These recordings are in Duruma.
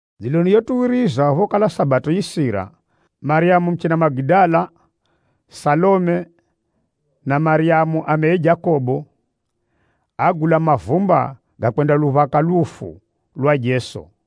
Dziloni yotuwiriza phokala Sabato yisira, Maryamu muchina Magidala, Salome na Maryamu ameye Jakobo, águla mavumba ga kwendaluphaka lufu lwa Jeso.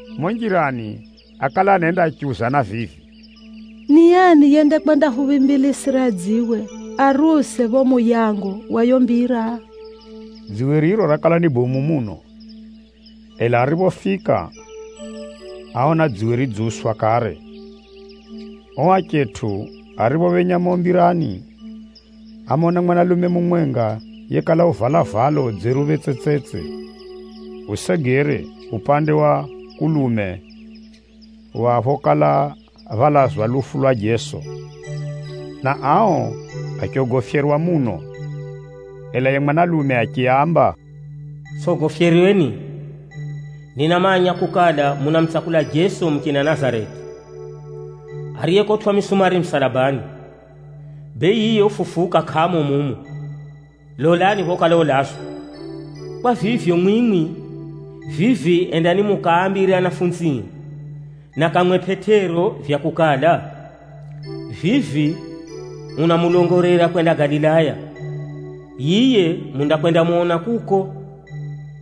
Mumo njirani, ákala anenda achiuzana vivi, “Ni ani yendakwendahuphimbilisira dziwe ariuse phapho muyango wa yiyo mbira?” Dziwe riro rakala ni bomu muno. Ela ariphofika, áona dziwe ridziuswa kare. Ao achetʼu ariphophenya mumo mbirani, ámona mwanalume mumwenga yekala uvala valo dzeruphe tsetsetse, usegere upande wa kulume wa phokala phalazwa lufu lwa Jeso, na ao achogofyerwa muno. Ela yiye mwanalume achiaamba, “Tsʼogofyerweni! Ninamanya kukala, munamutsakula Jeso muchina Nazareti, ariyekotwʼa misumari musalabani. Bee, yiye ufufuka kʼamo mumu. Lolani phokala ulazwa. Kwa vivyo, mwimwi vivi endani mukaambire anafunzie, na kamwe Pʼetero vya kukala, vivi unamulongolera kwenda Galilaya. Yiye mundakwendamona kuko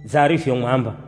dza arivyomwamba.”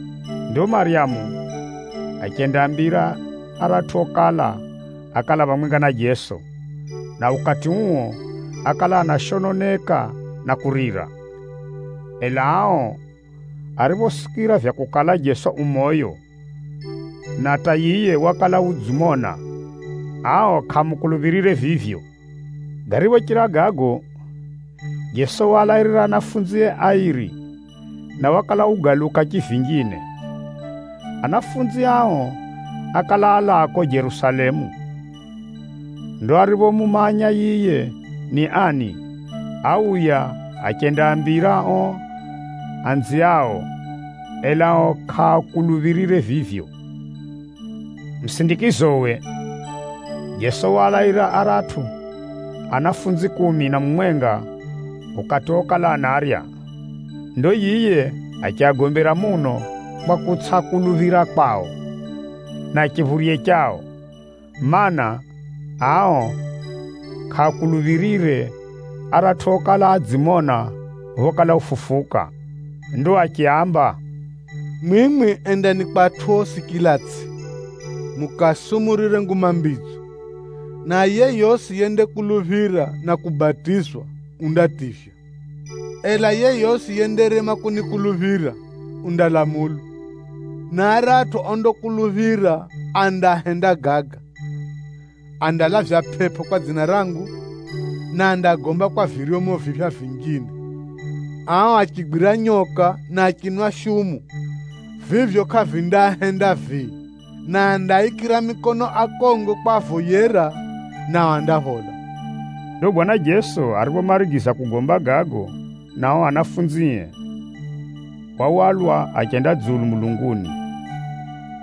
Ndo Maryamu achendaambira aratʼu okala, ákala phamwenga na Jeso, na ukati uo ákala anashononeka na kurira. Ela ao ariphosikira vya kukala Jeso u moyo, na hata yiye wakala udzimona, ao kʼaamukuluphirire vivyo. Gariphochira gago, Jeso waalairira anafunzie airi, na wakala ugaluka chivinjine. Anafunzi ao ákala alaa kuko Jerusalemu. Ndo ariphomumanya yiye ni ani, áuya achendaambira ao anziao, ela ao kʼaakuluphirire vivyo. Musindikizowe, Jeso waalairira aratʼu anafunzie kumi na mumwenga ukati okala anarya. Ndo yiye achiagombera muno kwa kutsʼakuluphira kwao, na chiphurye chao, mana, ao kʼaakuluphirire aratʼu okala adzimona phokala ufufuka. Ndo achiaamba, “Mwimwi endani kwa atʼu osi chila itsʼi, mukaasumurire Nguma Mbidzo. Na yeyosi yendakuluphira na kubatizwa, undativywa. Ela yeyosi yendarema kunikuluphira, undalamulwa. Na aratʼu ondakuluphira, andahenda gaga: andalavya pʼepʼo kwa dzina rangu, na andagomba kwa viryomo viphya vinjine. Ao achigwira nyoka, na achinwa shumu, vivyo kʼavindaahenda vii. Na andaaikira mikono akongo kwavoyera, nao andaphola.” Ndo Bwana Jeso ariphomarigiza kugomba gago na ao anafunzie, wahwalwa achenda dzulu mulunguni,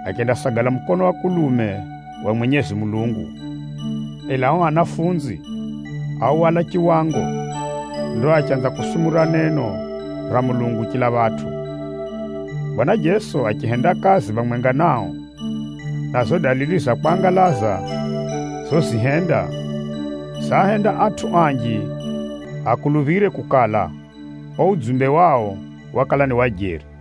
achendasagala mukono wa kulume wa Mwenyezi Mulungu. Ela ao anafunzi áhwala chiwango, ndo achanza kusumurira neno ra Mulungu chila phatʼu. Bwana Jeso achihenda kazi phamwenga nao, na zizo dalili za kwangalaza zozihenda, zaahenda atʼu anji akuluphire kukala, uo udzumbe wao wakala ni wa jeri.